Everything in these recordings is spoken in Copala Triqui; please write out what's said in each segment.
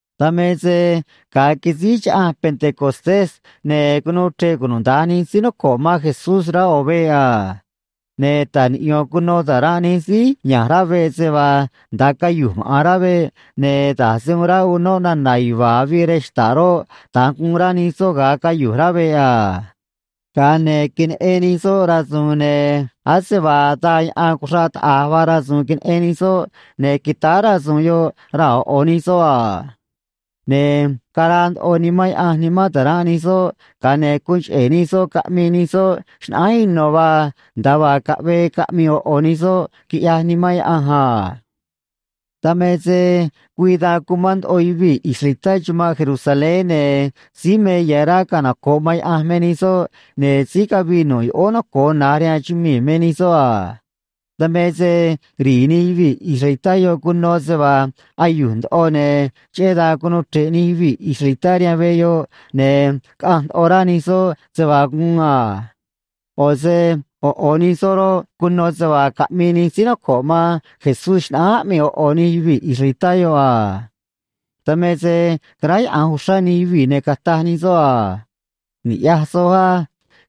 Dan me se ga̱a quisíj Chaꞌanj Pentecostés, ne̱ cunuu chre̱ꞌ cunuda̱nj nij síí noco̱ꞌ man Jesús rá ꞌo̱ veꞌ a. Ne̱ ta̱j niꞌyo̱n cuno ta̱ranꞌ nij síí ya̱nj rá veꞌ se vaa nda̱a cayu̱j maꞌa̱n rá veꞌ, ne̱ da̱j se uun ráꞌ unóꞌ nana̱ yuva̱a̱ avii rej xta̱ꞌ roꞌ, da̱nj guun rá nij soꞌ ga̱a cayu̱j rá veꞌ a. Ga̱a ne̱ queneꞌen nij soꞌ rasu̱u̱n, ne̱ ase vaa daa yaꞌan cuxraꞌ taꞌa̱j vaa rasu̱u̱n queneꞌen nij soꞌ, ne̱ quitáá rasu̱u̱n yoꞌ raa̱ ꞌo̱ ꞌo̱ nij soꞌ a. Ne̱ caraa ndoꞌo Nimán Yaꞌanj nimán ta̱ranꞌ nij soꞌ, ga̱a ne̱ guun cheꞌe̱ nij soꞌ caꞌmii nij soꞌ xnaꞌánj ino̱ vaa, nda̱a vaa caꞌvee caꞌmi̱i̱ ꞌo̱ ꞌo̱ nij soꞌ quiꞌyaj Nimán Yaꞌanj a. Dan me se güii dan cumán ndoꞌo yuvii̱ israelitá chumanꞌ Jerusalén, ne̱ síí me ya̱ rá canoco̱ꞌ man Yaꞌanj me nij soꞌ, ne̱ síí cavii nu̱ꞌ yoꞌóó noco̱o na̱j rihaan chumii̱ me nij soꞌ a. Dan me se ri̱i̱ nij yuvii̱ israelitá yoꞌ cuno se vaa ayu̱j ndoꞌo, ne̱ cheꞌé dan cunuu chre̱ꞌ nij yuvii̱ israelitá rihaan veꞌ yoꞌ, ne̱ caꞌanj ndoꞌo rá nij soꞌ se vaa guun a. ꞌO̱ se ꞌo̱ ꞌo̱ nij soꞌ roꞌ, cuno se vaa caꞌmii nij síí noco̱ꞌ man Jesús xnaꞌánj aꞌmii ꞌo̱ ꞌo̱ nij yuvii̱ israelitá yoꞌ a. Dan me se caráyaꞌa̱nj uxrá nij yuvii̱, ne̱ cataj nij soꞌ a: ―Ni̱ꞌyaj soj á.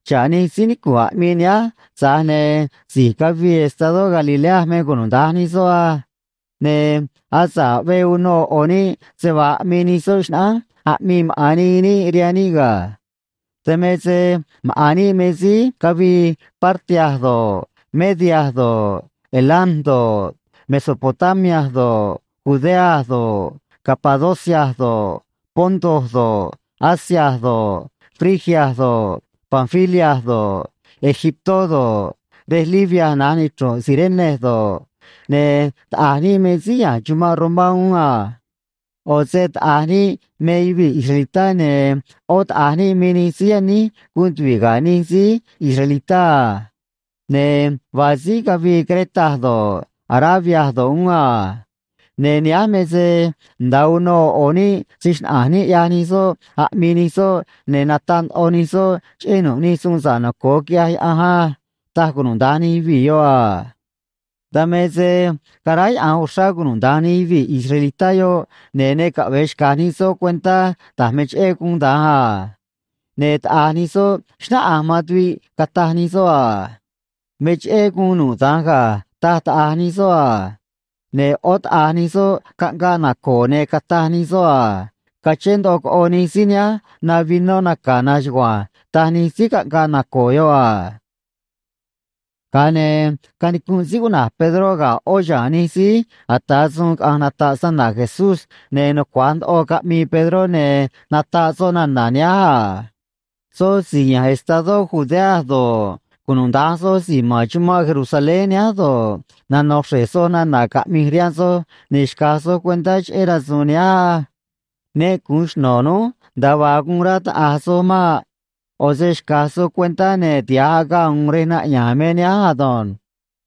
Xa̱ꞌ nij síí nicu̱nꞌ aꞌmii nihánj, tza̱j ne̱ si̱j cavii estadó Galilea me cunuda̱nj nij soꞌ á. Ne̱ asa̱ꞌ aꞌvee uno ꞌo̱ ꞌo̱ níꞌ se vaa aꞌmii nij soꞌ xnaꞌánj aꞌmii maꞌa̱n nii níꞌ rihaan níꞌ ga̱. Dan me se maꞌa̱n níꞌ me síí cavii Partia do̱ꞌ, Media do̱ꞌ, Elam do̱ꞌ, Mesopotamia do̱ꞌ, Judea do̱ꞌ, Capadocia do̱ꞌ, Ponto do̱ꞌ, Asia do̱ꞌ, Frigia do̱ꞌ, Panfilia do̱ꞌ, Egiptó do̱ꞌ, rej Libia na̱j nichru̱nꞌ Cirene do̱ꞌ, ne̱ taꞌa̱j níꞌ me síí ya̱nj chumanꞌ Romá uún a. ꞌO̱ se taꞌa̱j níꞌ me yuvii̱ israelitá, ne̱ ꞌó taꞌa̱j níꞌ me nij síí yaníj guun tuvi̱ꞌ ga̱ nij síí israelitá a. Ne̱ vaa síí cavii Creta do̱ꞌ, Arabia do̱ꞌ, uún a. Ne̱ nihánj me se nda̱a uno ꞌo̱ ꞌo̱ níꞌ se‑xnaꞌa̱nj níꞌ, ꞌyaj nij soꞌ aꞌmii nij soꞌ, ne̱ nataꞌ ndoꞌo nij soꞌ cheꞌé nu̱ꞌ nij suun sa̱ꞌ naco̱o quiꞌyaj Yaꞌanj á ―taj cunuda̱nj nij yuvii̱ yoꞌ a. Dan me se caráyaꞌa̱nj uxrá cunuda̱nj nij yuvii̱ israelitá yoꞌ, ne̱ ne caꞌve̱e xca̱j nij soꞌ cuentá da̱j me cheꞌé guun da̱nj a. Ne̱ taꞌa̱j nij soꞌ xnáꞌanj man tuviꞌ, cataj nij soꞌ a: ―Me cheꞌé guun nu̱ꞌ da̱nj ga̱ ―taj taꞌa̱j nij soꞌ a. Ne̱ ꞌó taꞌa̱j nij soꞌ caꞌngaꞌ naco̱o̱, ne̱ cataj nij soꞌ a: ―Cachén ndoꞌo coꞌo nij síí nihánj na vinó naca̱ na̱nj chugua̱nj ―taj nij síí caꞌngaꞌ naco̱o̱ yoꞌ a. Ga̱a ne̱ canicunꞌ síí cuꞌna̱j Pedró ga̱ ꞌó xa̱a̱n nij síí ata̱ suun caꞌa̱nj nata̱ꞌ snana̱ Jesús, ne̱ nucua̱j ndoꞌo caꞌmii Pedró ne̱ nataꞌ soꞌ nana̱ nihánj a: ―Soj si̱j ya̱nj estadó Judea do̱ꞌ, cunuda̱nj soj si̱j ma̱n chumanꞌ Jerusalén nihánj do̱ꞌ, nano̱ xre̱j soj nana̱ caꞌmi̱j rihaan soj, ne̱ xca̱j soj cuentá cheꞌé rasu̱u̱n nihánj á. Ne gu̱un xno̱ núj nda̱a vaa guun rá taꞌa̱j soj maꞌ. ꞌO̱ se xca̱j soj cuentá, ne̱ tiha̱j agaꞌ u̱u̱n rej naꞌya̱a̱n me nihánj ado̱nj.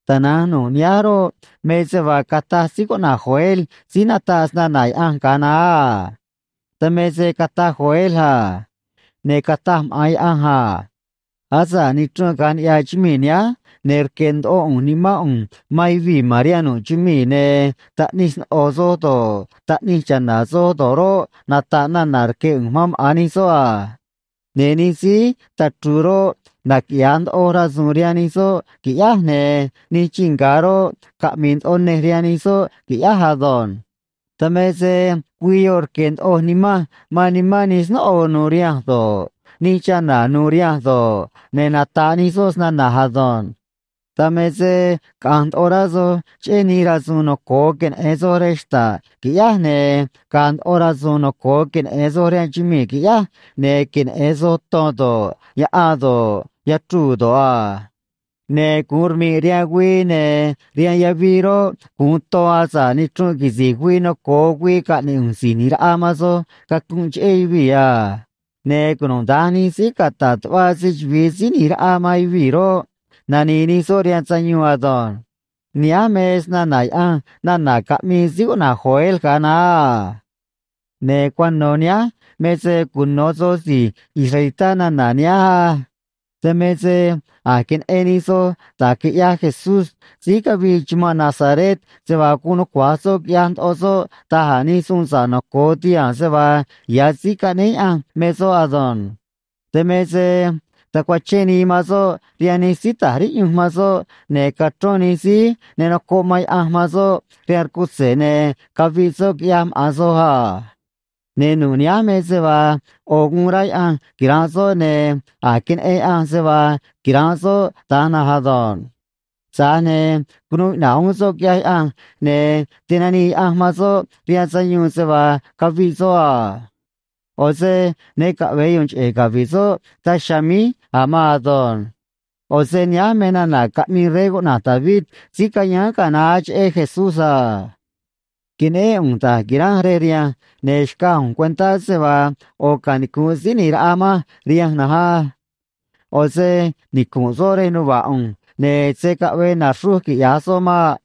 Tana̱nj nu̱ꞌ nihánj roꞌ, me se vaa cataj síí cuꞌna̱j Joel síí nataꞌ snana̱ Yaꞌanj ga̱a naá a. Dan me se cataj Joel a: Ne̱ cataj maꞌa̱n Yaꞌanj a: “Asa̱ꞌ nichrunꞌ caꞌa̱nj niꞌya̱ chumii̱ nihánj, ne̱ rque̱ ndoꞌo ꞌu̱nj Nimán ꞌu̱nj man yuvii̱ ma̱n rihaan nu̱ꞌ chumii̱, ne̱ taꞌnij sno̱ꞌo soj do̱ꞌ, taꞌnij cha̱na̱ soj do̱ꞌ roꞌ, nata̱ꞌ nana̱ rque̱ ꞌu̱nj man maꞌa̱n nij soꞌ a. Ne̱ nij síí tachru̱u̱ roꞌ, naquiꞌya̱a ndoꞌo rasu̱u̱n rihaan nij soꞌ, qui̱ꞌyáj, ne̱ nij chii nga̱ roꞌ, caꞌmi̱i̱ ndoꞌo nej rihaan nij soꞌ, qui̱ꞌyáj ado̱nj. Dan me se güii yoꞌ rque̱ ndoꞌoj Nimanj man nimán nij snóꞌo nu̱u̱ rihanj do̱ꞌ, nij chana̱ nu̱u̱ rihanj do̱ꞌ, ne̱ nata̱ꞌ nij soꞌ snana̱j ado̱nj. Dan me se caꞌa̱nj ndoꞌo rá soj cheꞌé nij rasu̱u̱n noco̱o queneꞌe̱n soj rej xta̱ꞌ, qui̱ꞌyáj, ne̱ ga̱a̱ ndoꞌo rasu̱u̱n noco̱o queneꞌe̱n soj rihaan chumii̱, qui̱ꞌyáj, ne̱ queneꞌe̱n soj ton do̱ꞌ, yaꞌan do̱ꞌ, yachruu̱ do̱ꞌ a. Ne̱ gu̱un rmi̱ꞌ rihaan güii, ne̱ rihaan yavii roꞌ, gu̱un ton, asa̱ꞌ nichrunꞌ quisi̱j güii noco̱o güii caꞌne̱ꞌ ꞌu̱nj Si̱j ꞌNi̱j Raꞌa man soj cacunꞌ cheꞌé yuvii̱ a. Ne̱ cunuda̱nj nij síí cata̱ꞌ tuꞌva se‑chuvi̱i Síí ꞌNi̱j Raꞌa man yuvii̱ roꞌ, nani̱i̱ nij soꞌ rihaan sayuun ado̱nj.” Nihánj me snana̱ Yaꞌanj nana̱ caꞌmii síí cuꞌna̱j Joel ga̱a naá a. ’Ne̱ cuano̱ nihánj me se cuno̱ soj si̱j israelitá nana̱ nihánj á. Dan me se a̱j queneꞌen nij soj da̱j quiꞌyaj Jesús síí cavii chumanꞌ Nazaret, se vaa guun nucua̱j soꞌ quiꞌyaj ndoꞌo soꞌ da̱j a̱ nij suun sa̱ꞌ noco̱o tihaa̱n se vaa ya̱ Síí Caꞌnéé Yaꞌanj me soꞌ ado̱nj. Dan me se tacuachén nii man soꞌ rihaan nij síí ta̱j riꞌyunj man soꞌ, ne̱ cachrón nij síí ne nocoꞌ man Yaꞌanj man soꞌ rihaan rcutze̱, ne̱ caviꞌ soꞌ, quiꞌyaj maꞌa̱n soj a. Ne̱ nu̱ꞌ nihánj me se vaa ꞌo̱ guun rá Yaꞌanj quira̱nꞌ soꞌ, ne̱ a̱j queneꞌen Yaꞌanj se vaa quira̱nꞌ soꞌ da̱nj na̱nj ado̱nj. Tza̱j ne̱ cunuu iꞌna̱ꞌ uún soꞌ, quiꞌyaj Yaꞌanj, ne̱ tinanii Yaꞌanj man soꞌ rihaan sayuun se vaa caviꞌ soꞌ a. ꞌO̱ se ne caꞌve̱e yu̱u̱n cheꞌe̱ cavi̱ꞌ soꞌ daj chiha̱a̱ míj a̱ maan ado̱nj. ’ꞌO̱ se nihánj me nana̱ caꞌmii rey cuꞌna̱j David, síí cayáán ga̱a naá, cheꞌé Jesús a: Queneꞌén ꞌu̱nj da̱j qui̱ranj rej rihanj, ne̱ xcaj ꞌu̱nj cuentá se vaa ꞌo̱ canicu̱nꞌ Síí ꞌNi̱j Raꞌa manj rihanj na̱nj á. ꞌO̱ se nicu̱nꞌ soꞌ rej nuva̱ꞌ ꞌu̱nj, ne̱ se̱ caꞌvee na̱xruj, quiꞌya̱j soꞌ maꞌ.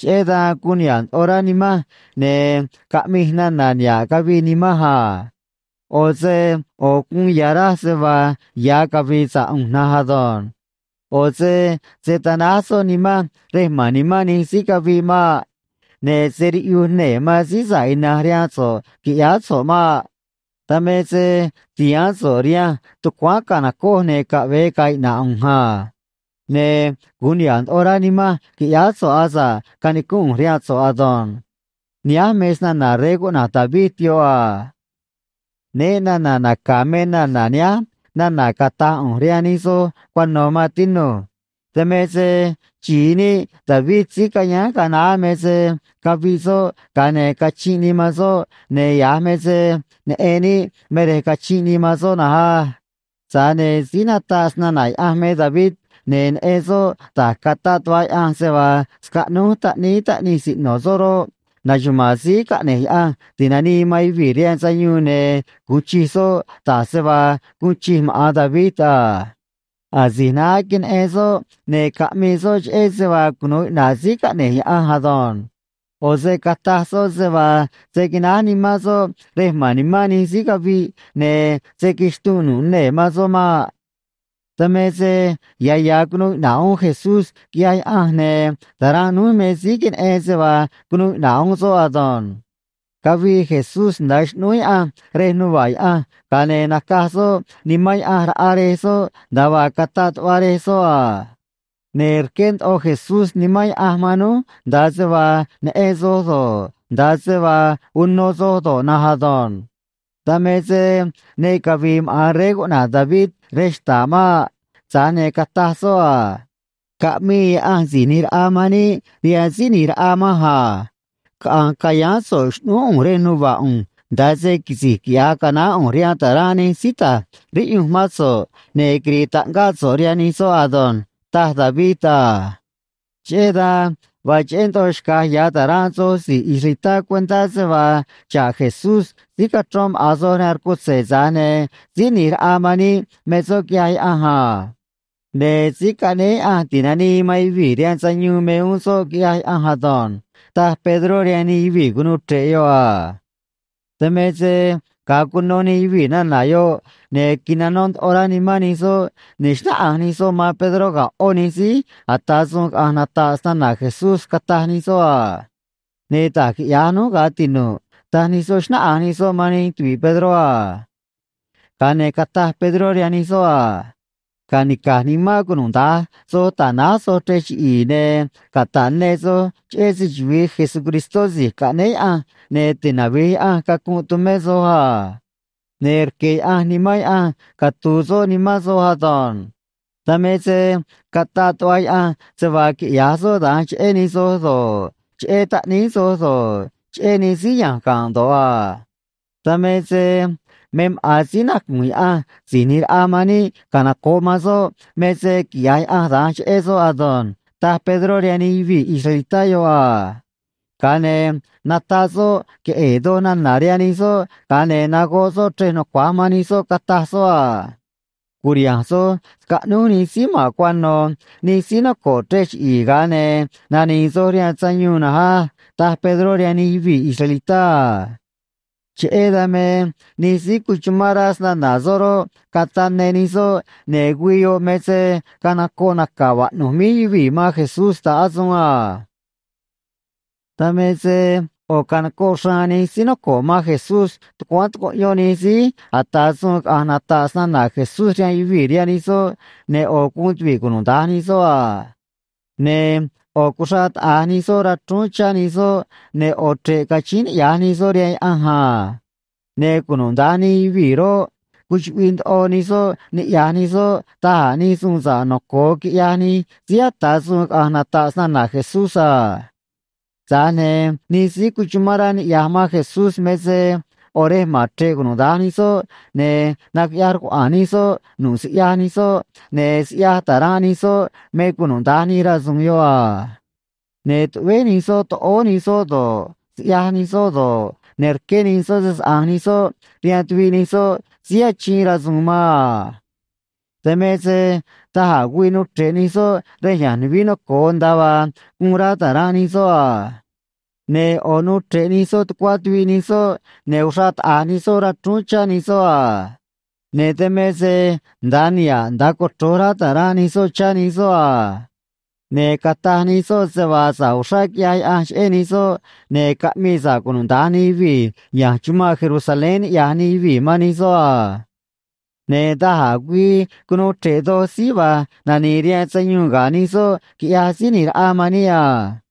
Cheꞌé dan guun niha̱ꞌ ndoꞌo rá nimanj, ne̱ caꞌmij nana̱ niha̱ꞌ cavii nimanj a. ꞌO̱ se ꞌo̱ guun ya̱ raj se vaa ya̱ cavi̱i̱ sa̱ꞌ ꞌu̱nj na̱nj ado̱nj. ꞌO̱ se se̱ tanáj so̱ꞌ nimanj rej ma̱n nimán nij síí caviꞌ maꞌ. Ne̱ se̱ riꞌyuj nee̱ man Síí Sa̱ꞌ Ina̱nj rihaan so̱ꞌ, qui̱ꞌyáá so̱ꞌ maꞌ. Dan me se tihaán so̱ꞌ rihanj tucuáán ca̱nocoj ne̱ caꞌve̱e ga̱a̱ iꞌna̱ꞌ ꞌu̱nj a. Ne̱ gu̱un niha̱ꞌ ndoꞌo rá nimanj, qui̱ꞌyáá so̱ꞌ, asa̱ꞌ canicúnꞌ ꞌu̱nj rihaan so̱ꞌ ado̱nj. Nihánj me snana̱ rey cuꞌna̱j David yoꞌ a. ’Né na̱na̱ naca̱ me nana̱ nihánj nana̱ cata̱j ꞌu̱nj rihaan nij soj cuano̱, maan tinu̱j. Dan me se xi̱i níꞌ David, síí cayáán ga̱a naá, me se caviꞌ soꞌ, ga̱a ne̱ cachinꞌ nii man soꞌ, ne̱ ya̱j me se neꞌen níꞌ me rej cachinꞌ nii man soꞌ na̱nj á. Tza̱j ne̱ síí nataꞌ snana̱ Yaꞌanj me David, ne̱ neꞌen soꞌ da̱j cataꞌ tuꞌva Yaꞌanj se vaa scaꞌnúj taꞌníí taꞌnij siꞌno̱ soꞌ roꞌ, naxuma̱a̱n Síí Caꞌne̱j Yaꞌanj Ti̱nanii man Yuvii̱ rihaan Sayuun, ne̱ gu̱un chij soꞌ da̱j se vaa guun chij maꞌa̱n David a. Asi̱j naá queneꞌen soꞌ, ne̱ caꞌmii soꞌ cheꞌé se vaa cunu̱u iꞌna̱ꞌ Síí Caꞌne̱j Yaꞌanj ado̱nj. ꞌO̱ se cataj soꞌ se vaa se̱ quináj nimán soꞌ rej ma̱n nimán nij síí caviꞌ, ne̱ se̱ quixtunꞌ nu̱ꞌ nee̱ man soꞌ maꞌ. ’Dan me se ya̱ ya̱ cunuu iꞌna̱ꞌ uún Jesús, quiꞌyaj Yaꞌanj, ne̱ ta̱ranꞌ núj me síí queneꞌen se vaa cunuu iꞌna̱ꞌ uún soꞌ ado̱nj. Cavii Jesús nda̱a xꞌnúú Yaꞌanj rej nuva̱ꞌ Yaꞌanj, ga̱a ne̱ nacaj soꞌ Nimán Yaꞌanj raꞌa Rej soꞌ nda̱a vaa cataꞌ tuꞌva Rej soꞌ a. Ne̱ rqué ndoꞌo Jesús Nimán Yaꞌanj man núj nda̱a se vaa neꞌen soj do̱ꞌ, nda̱a se vaa uno soj do̱ꞌ na̱nj ado̱nj. ’Dan me se ne cavi̱i̱ maꞌa̱n rey cuꞌna̱j David rej xta̱ꞌ maꞌ. Tza̱j ne̱ cataj soꞌ a: Caꞌmii Yaꞌanj Si̱j ꞌNi̱j Raꞌa man níꞌ rihaan Síí ꞌNi̱j Raꞌa manj a: “Caꞌa̱nj ca̱yáán so̱ꞌ xꞌnúú ꞌu̱nj rej nuva̱ꞌ ꞌu̱nj, nda̱a se quisi̱j quiꞌya̱j canaán ꞌu̱nj rihaan ta̱ranꞌ nij síí ta̱j riꞌyunj mán so̱ꞌ, ne̱ quiri̱i̱ taꞌngáꞌ so̱ꞌ rihaan nij soꞌ ado̱nj”, taj David a. Cheꞌé dan vaa cheꞌé ndoꞌo xca̱j ya̱ ta̱ranꞌ soj si̱j israelitá cuentá se vaa xa̱ꞌ Jesús síí cachrón maꞌa̱n soj rihaan rcutze̱, tza̱j ne̱ Síí ꞌNi̱j Raꞌa man níꞌ me soꞌ quiꞌyaj Yaꞌanj a. Ne̱ Síí Caꞌnéé Yaꞌanj Ti̱nanii man Yuvii̱ rihaan Sayuun me uún soꞌ quiꞌyaj Yaꞌanj ado̱nj ―taj Pedró rihaan nij yuvii̱ cunuu chre̱ꞌ yoꞌ a. Dan me se ga̱a cuno nij yuvii̱ nana̱ yoꞌ, ne̱ quinanó ndoꞌo rá nimán nij soꞌ, ne̱ xnáꞌanj nij soꞌ man Pedró ga̱ ꞌó nij síí ata̱ suun caꞌa̱nj nata̱ꞌ snana̱ Jesús, cataj nij soꞌ a: ―Ne̱ da̱j quiꞌya̱j núj, ga̱ tinu̱ꞌ ―taj nij soꞌ, xnáꞌanj nij soꞌ man nij tuvi̱ꞌ Pedró a. Ga̱a ne̱ cataj Pedró rihaan nij soꞌ a: ―Ca̱nica̱j nimán cunuda̱nj soj ta̱náj soj chrej chiꞌi̱i̱, ne̱ cata̱ꞌ ne soj cheꞌé se‑chuvi̱i Jesucristó Si̱j Caꞌnéé Yaꞌanj, ne̱ tinavi̱j Yaꞌanj cacunꞌ tumé soj a. Ne̱ rque̱ Yaꞌanj Nimán Yaꞌanj catu̱u̱ soꞌ nimán soj ado̱nj. Dan me se cataꞌ tuꞌva Yaꞌanj se vaa quiꞌya̱j soꞌ da̱nj cheꞌé nij soj do̱ꞌ, cheꞌé taꞌníí soj do̱ꞌ, cheꞌé nij síí ya̱nj ga̱nꞌ do̱ꞌ a. Dan me se me maꞌa̱n síí nacu̱nj Yaꞌanj Si̱j ꞌNi̱j Raꞌa man níꞌ canoco̱ꞌ man soꞌ me se quiꞌya̱j Yaꞌanj da̱nj cheꞌé soꞌ ado̱nj ―taj Pedró rihaan nij yuvii̱ israelitá yoꞌ a. Ga̱a ne̱ nataꞌ soꞌ queꞌe̱e̱ doj nana̱ rihaan nij soꞌ, ga̱a ne̱ nagoꞌ soꞌ chrej nucua̱j man nij soꞌ, cataj soꞌ a: ―Cu̱riha̱nj soj scaꞌnúj nij síí ma̱n cuano̱ nij síí noco̱ꞌ chrej chiꞌi̱i̱, ga̱a ne̱ nani̱i̱ soj rihaan sayuun na̱nj á ―taj Pedró rihaan nij yuvii̱ israelitá a. Cheꞌé dan me nij síí cuchumán rá snana̱ soꞌ roꞌ, cataꞌ ne nij soꞌ, ne̱ güii yoꞌ me se canocoꞌ naca̱ vaꞌnu̱j míj yuvii̱ man Jesús ta̱ꞌ asuun a. Dan me se ꞌo̱ canocoꞌ xraan nij síí noco̱ꞌ man Jesús tucuáán tucuꞌyón nij síí ata̱ suun caꞌa̱nj nata̱ꞌ snana̱ Jesús rihaan yuvii̱ rihaan nij soꞌ, ne̱ ꞌo̱ guun tuvi̱ꞌ cunuda̱nj nij soꞌ a. Ne̱ ꞌo̱ cuxraꞌ taꞌa̱j nij soꞌ rachrúún chá nij soꞌ, ne̱ ꞌo̱ chre̱ꞌ cachíín niꞌya̱j nij soꞌ rihaan Yaꞌanj a. Ne̱ cunuda̱nj nij yuvii̱ roꞌ, cuchuꞌviꞌ ndoꞌo nij soꞌ niꞌya̱j nij soꞌ da̱j a̱ nij suun sa̱ꞌ noco̱o quiꞌyaj nij síí ata̱ suun caꞌa̱nj nata̱ꞌ snana̱ Jesús a. Tza̱j ne̱ nij síí cuchumán rá niꞌya̱j man Jesús me se ꞌo̱ rej ma̱n chre̱ꞌ cunuda̱nj nij soꞌ, ne̱ naquiꞌyaj rcuaꞌa̱a̱n nij soꞌ nu̱ꞌ siꞌyaj nij soꞌ, ne̱ siꞌyaj ta̱ranꞌ nij soꞌ me cunuda̱nj nij rasu̱u̱n yoꞌ a. Ne̱ tuꞌvéj nij soꞌ toꞌóó nij soꞌ do̱ꞌ, siꞌyaj nij soꞌ do̱ꞌ, ne̱ rqué nij soꞌ se‑saꞌa̱nj nij soꞌ rihaan tuviꞌ nij soꞌ síí achiin rasu̱u̱n man a. Dan me se da̱j a̱ güii nuu chre̱ꞌ nij soꞌ rej ya̱nj nuvií noco̱o, nda̱a vaa guun rá ta̱ranꞌ nij soꞌ a. Ne̱ ꞌo̱ nuu chre̱ꞌ nij soꞌ tucuá tuviꞌ nij soꞌ, ne̱ uxraꞌ taꞌa̱j nij soꞌ rachrúún chá nij soꞌ a. Ne̱ dan me se nda̱a niha̱ꞌ nda̱a cochro̱j rá ta̱ranꞌ nij soꞌ chá nij soꞌ a. Ne̱ cataj nij soꞌ se vaa sa̱ꞌ uxrá quiꞌyaj Yaꞌanj cheꞌé nij soꞌ, ne̱ caꞌmii sa̱ꞌ cunuda̱nj nij yuvii̱ ya̱nj chumanꞌ Jerusalén niꞌya̱j nij yuvii̱ man nij soꞌ a. Ne̱ da̱j a̱ güii cunuu chre̱ꞌ doj síí va̱j nani̱i̱ rihaan sayuun ga̱ nij soꞌ, quiꞌyaj Síí ꞌNi̱j Raꞌa man níꞌ a.